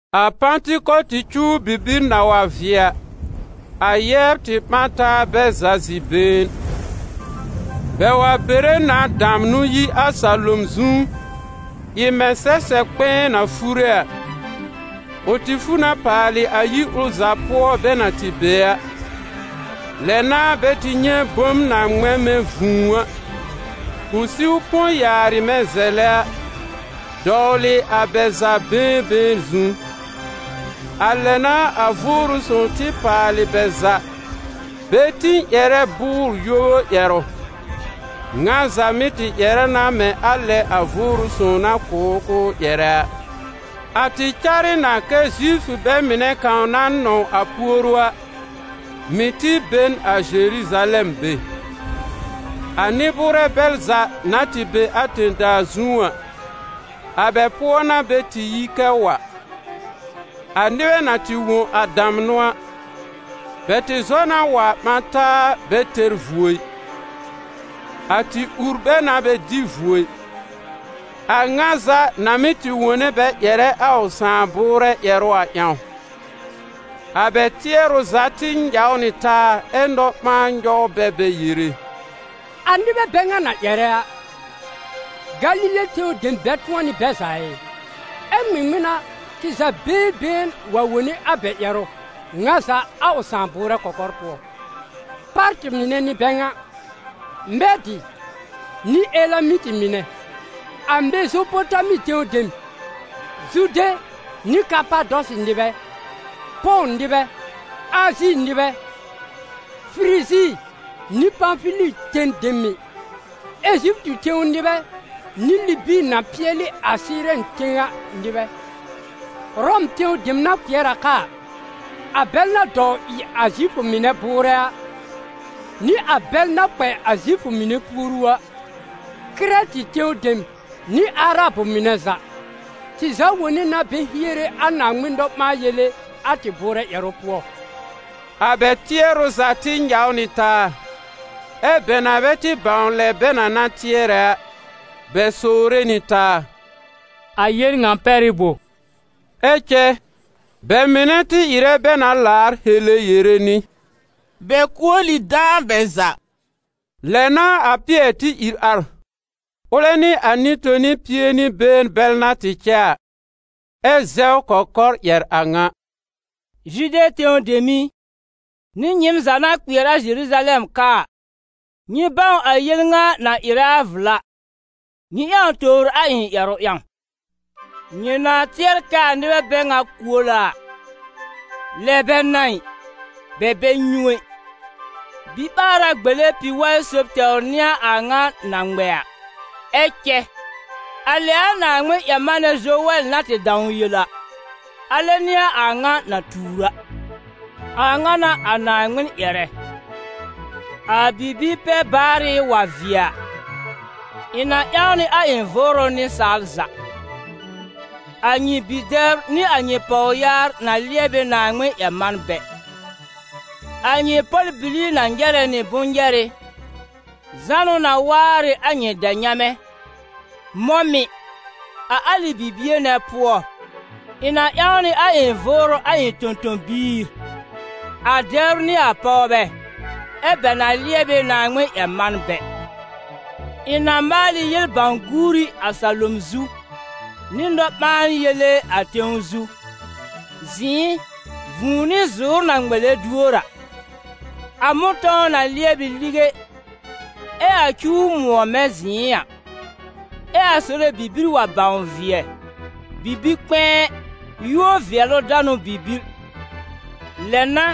A Pãtɩkɔtɩ cuw bibir na wa vɩɛ a, a yɛbr tɩ ɓã n taa bɛ za zi-been. Bɛ wa bere na damnʋ yi a salom zu, ɩ mɛ̃ sɛsɛb kpɛ̃ɛ na fure a; ʋ tɩ fu na paalɩ a yir ʋl za pʋɔ bɛ na tɩ be a. Lɛ n'a bɛ tɩ nyɛ̃ bom na ŋmɛ̃ mɛ̃ vũu a, ʋ siw põ yaarɩ mɛ̃ zɛlɛ a, dɔwlɩ a bɛ za been been zu. A lɛ n'a a Vʋʋrʋ Sõw tɩ paalɩ bɛ za bɛ tĩ ƴɛrɛ bʋʋr-yoru ƴɛrʋ. Ŋa za mɩ́ tɩ ƴɛrɛ na mɛ̃ a lɛ a Vʋʋrʋ Sõw na kʋ̀ ʋ k'ʋʋ ƴɛrɛ a. A tɩ car ɩ na kɛ́ Zifʋ bɛ mɩnɛ kãw na nɔ̃w a puoru a, mɩ̀ tɩ be n a Zeruzalɛm be; a nɩ-bʋʋrɛ bɛl za na tɩ be a tẽ-daa zu a, a bɛl pʋɔ n'a bɛ tɩ yi kɛ wa. A nɩbɛ na tɩ wõ a damnʋ a, bɛ tɩ zɔ na wa ɓã taa bɛ tɛr vuo ɩ. A tɩ ur bɛ na bɛ dɩ vuo ɩ, a ŋa za na mɩ́ tɩ wone bɛ ƴɛrɛ a ʋ sãà bʋʋrɛ ƴɛrʋ a ƴãw. A bɛ tɩɛrʋ za tɩ nyaw nɩ taa ɛ nɔ-ɓãan nyɔw bɛ bɛ yere: «A nɩbɛ bɛ ŋa na ƴɛrɛ a, Galile tẽw dem bɛ tʋ̃ɔ n'ɩ bɛ za ɩ? Ɛ ŋmɩŋmɩn n'a tɩ za been been wa wone a bɛ ƴɛrʋ, ŋa za a ʋ sãà bʋʋrɛ kɔkɔr pʋɔ? Pártɩ̀ mɩnɛ n'ɩ bɛ ŋa, Mɛ́dɩ̀ nɩ Elamɩtɩ mɩnɛ, a Mezopotami tẽw dem, Zude nɩ Kapadɔsɩ nɩbɛ, Pɔ̃w nɩbɛ, Azi nɩbɛ, Firizi nɩ Pãfili ten dem mɩ̀, Eziptɩ tẽw nɩbɛ nɩ Libi na pɩɛlɩ a Sɩɩrɛn tẽw a nɩbɛ, Ʋrɔm tẽw dem na kpɩɛr a ka a, a bɛl na dɔw ɩ a Zifʋ mɩnɛ bʋʋrɛ a, nɩ a bɛl na kpɛ a Zifʋ mɩnɛ puoru a, Kɩrɛtɩ tẽw dem nɩ Arabʋ mɩnɛ za, tɩ za wone na bɛ hiere a Naaŋmɩn nɔ-ɓãa-yele a tɩ bʋʋrɛ ƴɛrʋ pʋɔ.» A bɛ tɩɛrʋ za tɩ nyaw nɩ taa, ɛ́ bɛ na bɛ tɩ bãw lɛ bɛ na na tɩɛrɛ a, bɛ sowre nɩ taa: «A yel ŋa pɛr ɩ bo?» Ɛ cɛ bɛ mɩnɛ tɩ ɩrɛ bɛ na laar hele yere nɩ: «Bɛ kuol ɩ dãa bɛ za!» Lɛ n'a a Pɩɛr tɩ ìr ar, ʋlɛ nɩ a nɩ-toni pie nɩ been bɛl na tɩ cɛ a, ɛ́ zɛw kɔkɔr ƴɛr a ŋa: «Zude tẽw dem i, nɩ nyɩɩm za na kpɩɛr a Zeruzalɛm ka a, nyɩ bãw a yel ŋa na ɩrɛ a vla, nyɩ ƴãw tobr a ɩ̃ ƴɛrʋ ƴãw. Nyɩ na tɩɛr kɛ a nɩbɛ bɛ ŋa kuol a a, lɛ bɛ n'a ɩ. Bɛ bɛ nyũ ɛ, biɓaara gbele pi-waɩ sob tɛwr n'ɩ a ŋa na ŋmɛ a. Ɛ cɛ, a lɛ a Naaŋmɩn-ƴɛr-manɛ Zowɛl na tɩ dãw yel a, alɛ n'ɩ a a ŋa na tuur a: ‹A ŋa n'a a Naaŋmɩn ƴɛrɛ: a bibi-pɛ-baarɩ wa vɩɛ a, ɩ̃ na ƴãw nɩ a ɩ̃ Vʋʋrʋ nɩsaal za; a nyɩ bi-dɛbr nɩ a nyɩ pɔwyaar na lɩɛb ɩ Naaŋmɩn-ƴɛr-manbɛ, a nyɩ pɔl-bili na nyɛrɛ nɩ bʋ̃-nyɛrɩ, zánʋ na waar ɩ a nyɩ dɛ-nyamɛ, mɔ̃ mɩ̀, a alɩ bibie nɛ pʋɔ, ɩ̃ na ƴãw nɩ a ɩ̃ Vʋʋrʋ a ɩ̃ tõ-tõ-biir, a dɛbr nɩ a pɔwbɛ, ɛ́ bɛ na lɩɛb ɩ Naaŋmɩn-ƴɛr-manbɛ. Ɩ̃ na maal ɩ yel-bãw-guuri a salom zu, nɩ nɔ-ɓãa-yele a tẽw zu: zɩ̃ɩ, vũu nɩ zʋ̀ʋ́r na ŋmɛlɛ duor a. A mʋ̃tɔ̃w na lɩɛb ɩ lige ɛ a cuw mʋ̃ɔ mɛ̃ zɩ̃ɩ a, ɛ a Sore bibir wa bãw vɩɛ, bibi-kpɛ̃ɛ, yúor-vɩɛlʋ-danʋ bibir. Lɛ n'a,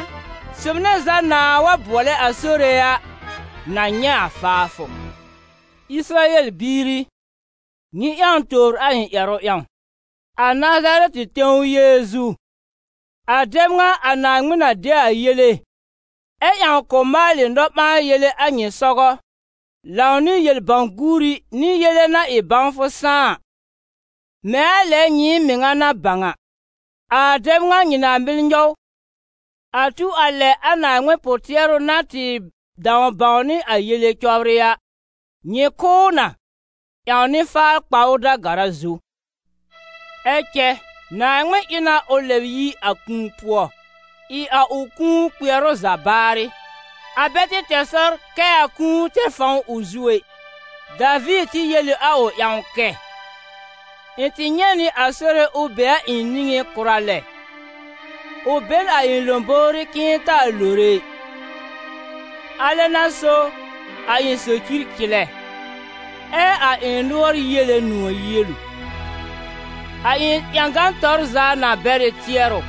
sob nɛ za nãa wa bʋɔlɛ a Sore a, na nyɛ̃ a faafʋ.›» «Ɩsɩrayɛl biir i, nyɩ ƴãw tobr a ɩ̃ ƴɛrʋ ƴãw: a Nazarɛtɩ tẽw Yeezu, a dɛb ŋa a Naaŋmɩn na de a yele, ɛ ƴãw k'ʋ maalɩ nɔ-ɓãa-yele a nyɩ sɔgɔ, lãw nɩ yel-bãw-guuri nɩ yele na ɩ bãwfʋ sãá a, mɛ̃ a lɛ nyɩɩm mɩŋa na bãw a, a dɛb ŋa nyɩ na mɩl nyɔw, a tu a lɛ a Naaŋmɩn pʋ-tɩɛrʋ na tɩ dãw bãwnɩ a yele cɔbrɩ a, nyɩ kʋ́ ʋ na, ƴãw nɩ-faar kpa ʋ da-gara zu. Ɛ cɛ Naaŋmɩn ɩ na ʋ lɛb yi a kũu pʋɔ, ɩ a ʋ kũu kpɩɛrʋ za baarɩ: a bɛ tɩ tɛr sɔr kɛ a kũu tɛr fãw ʋ zu ɛ. Daviir tɩ yel ɩ a ʋ ƴãw kɛ: ‹Ɩ̃ tɩ nyɛ̃ nɩ a Sore ʋ be a ɩ̃ niŋé kʋra lɛ, ʋ be n a ɩ̃ lõbówrí k'ɩ̃ɩ taa lore ɩ. Alɛ n'a so, a ɩ̃ socir cɩlɛ, ɛ a ɩ̃ nʋɔr yiele nʋ̃ɔ̀ yielu. A ɩ̃ ƴãgan tɔr za na bɛr ɩ tɩɛrʋ,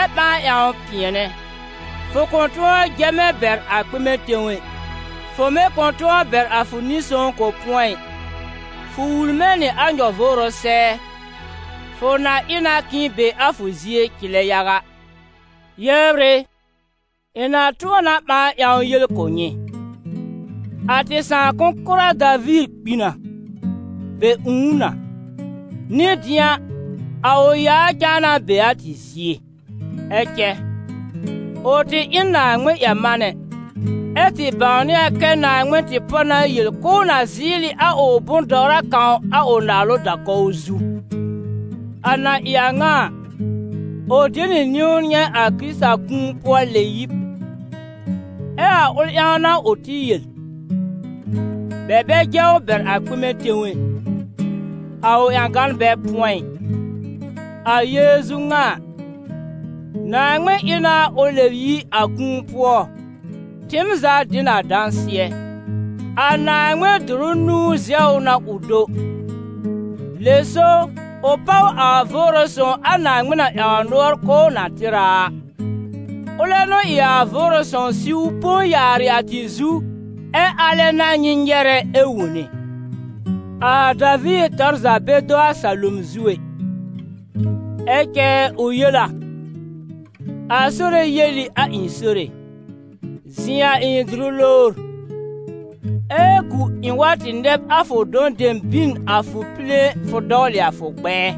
ɛ ɓãa ƴãw pɩɛnɛ: fʋ kʋ̃ tʋ̃ɔ jɛ mɛ̃ bɛr a kpɩmɛ tẽw ɛ, fʋ mɩ̀ kʋ̃ tʋ̃ɔ bɛr a fʋ Nɩ-sõw k'ʋ pʋ̃ɔ ɩ. Fʋ wul mɛ̃ nɩ a nyɔ-vʋʋrʋ sɛɛ, fʋ na ɩ na k'ɩ̃ be a fʋ zie cɩlɛ yaga.›» «Yɛbr ɩ, ɩ̃ na tʋ̃ɔ na ɓãa ƴãw yel kʋ̀ nyɩ: a tɩ sãakʋ̃-kʋra Daviir kpi na, bɛ ũù ʋ na, nɩ dɩ̃a, a ʋ yaa cãa na be a tɩ zie. Ɛ cɛ, ʋ tɩ ɩ n Naaŋmɩn-ƴɛr-manɛ, ɛ́ tɩ bãwnɩ a kɛ Naaŋmɩn tɩ pɔ na yel k'ʋʋ na zɩɩlɩ nɩ a ʋ bʋ̃-dɔwra kãw a ʋ naalʋ da-kɔw zu. A na ɩ a ŋa a, ʋ de nɩ niwn nyɛ̃ a Kɩrɩtakũu-pʋɔ-lɛ-yib. Ɛ a ʋl ƴãw n'a ʋ tɩ yel: ‹Bɛ bɛ jɛ ʋ bɛr a kpɩmɛ tẽw ɛ, ɛ a ʋ ƴãgan bɛ pʋ̃ɔ ɩ.›» «A Yeezu ŋa a, Naaŋmɩn ɩ na ʋ lɛb yi a kũu pʋɔ, tɩɩm za dɩ n a dãsɩɛ. A Naaŋmɩn dʋrʋ zɛw ʋ na ʋ do. Lɛ so ʋ páw a Vʋʋrʋ Sõw a Naaŋmɩn na ƴãw nʋɔr k'ʋʋ na tɩr a a; ʋlɛ n'ʋ ɩ a Vʋʋrʋ Sõw siw põ yaarɩ a tɩ zu, ɛ alɛ n'a nyɩ nyɛrɛ ɛ wone. A Daviir tɔr za bɛ do a salom zu ɛ, ɛ cɛ ʋ yel a: ‹A Sore yel ɩ a ɩ̃ Sore: zɩ̃ a ɩ̃ dʋrʋ lowr, ɛ gu ɩ̃ wa tɩ nɛb a fʋ dɔ̃ dem bin a fʋ pile fʋ dɔwlɩ a fʋ gbɛɛ.›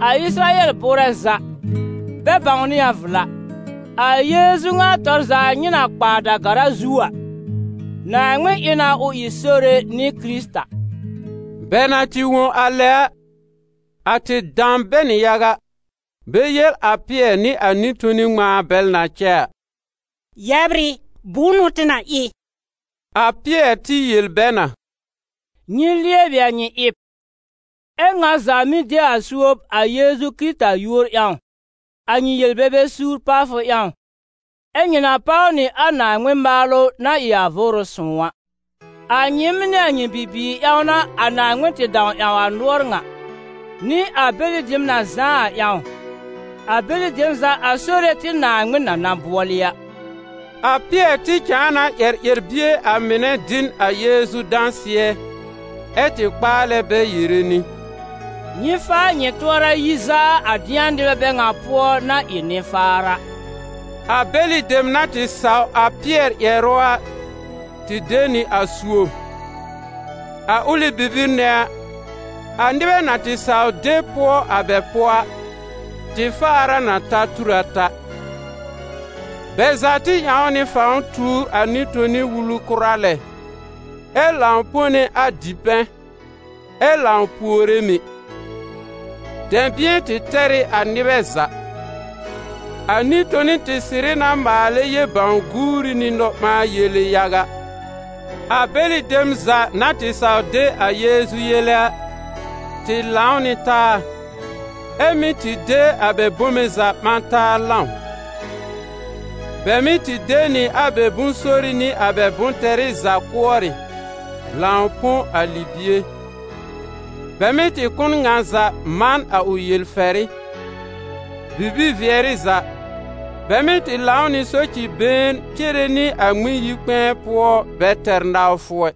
A Ɩsɩrayɛl bʋʋrɛ za, bɛ bãwnɩ a vla: a Yeezu ŋa tɔr za nyɩ na kpa a da-gara zu a, Naaŋmɩn ɩ na ʋ ɩ Sore nɩ Kɩrɩta.» Bɛ na tɩ wõ a lɛ a, a tɩ dam bɛ nɩ yaga, bɛ yel a Pɩɛr nɩ a nɩ-toni ŋmãa bɛl na cɛ a: «Yɛbr ɩ, bʋ̃ʋ n'ʋ tɩ na ɩ?» A Pɩɛr tɩ yel bɛ na: «Nyɩ lɩɛbɩ a nyɩ ɩb, ɛ́ ŋa za mɩ́ de a suob a Yeezu Kɩrɩta yúor ƴãw, a nyɩ yel-bebe suur pawfʋ ƴãw, ɛ nyɩ na páw nɩ a Naaŋmɩn maalʋ na ɩ a Vʋʋrʋ Sõw a. A nyɩɩm nɩ a nyɩ bibiir ƴãw n'a a Naaŋmɩn tɩ dãw ƴãw a nʋɔr ŋa, nɩ a bɛlɩ dem na zãá a ƴãw, a bɛlɩ dem za a Sore tɩ Naaŋmɩn na na bʋɔlɩ a.» A Pɩɛr tɩ cãa na ƴɛr ƴɛr-bie a mɩnɛ dɩ n a Yeezu dãsɩɛ, ɛ́ tɩ kpaalɛ bɛ yere nɩ: «Nyɩ faa nyɩ tʋɔra yi zaa a dɩ̃a nɩbɛ bɛ ŋa pʋɔ na ɩ nɩ-faar a.» A bɛlɩ dem na tɩ saw a Pɩɛr ƴɛrʋ a tɩ de nɩ a suob. A ʋlɩ bibir nɛ a, a nɩbɛ na tɩ saw de pʋɔ a bɛ pʋɔ a, tɩ faar a na ta tur ata. Bɛ za tɩ ƴãw nɩ fãw tuur a nɩ-toni wulu kʋra lɛ, ɛ lãw pone a dipɛ̃, ɛ lãw puore mɩ̀. Dɛ̃bɩ̃ɛ tɩ tɛr ɩ a nɩbɛ za: a nɩ-toni tɩ sɩrɩ na maalɛ yel-bãw-guuri nɩ nɔ-ɓãa-yele yaga. A bɛlɩ dem za na tɩ saw de a Yeezu yele a, tɩ lãw nɩ taa, ɛ́ mɩ́ tɩ de a bɛ bome za ɓã taa lãw. Bɛ mɩ́ tɩ de nɩ a bɛ bʋ̃-sori nɩ a bɛ bʋ̃-tɛrɩ za kʋɔrɩ, lãw põ a libie: bɛ mɩ́ tɩ kʋ̀ n ŋa za man a ʋ yel-fɛrɩ. Bibi-vɩɛrɩ za, bɛ mɩ́ tɩ lãw nɩ soci-been cere nɩ a Ŋmɩn-yi-kpɛ̃ɛ pʋɔ bɛ tɛr nawfʋ ɛ,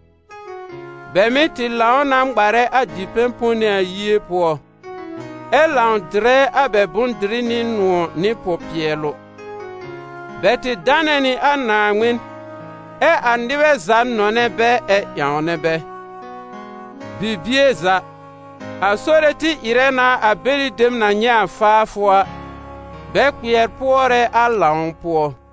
bɛ mɩ́ tɩ lãw na ŋmarɛ a dipɛ̃ pone a yie pʋɔ, ɛ lãw dɩrɛ a bɛ bʋ̃-dɩrɩ nɩ nʋ̃ɔ̀ nɩ pʋ-pɩɛlʋ. Bɛ tɩ danɛ nɩ a Naaŋmɩn, ɛ a nɩbɛ za nɔnɛ bɛ ɛ ƴãwnɛ bɛ. Bibie za, a Sore tɩ ɩrɛ na a bɛlɩ dem na nyɛ̃ a faafʋ a, bɛ kpɩɛr pʋɔrɛ a lãw pʋɔ.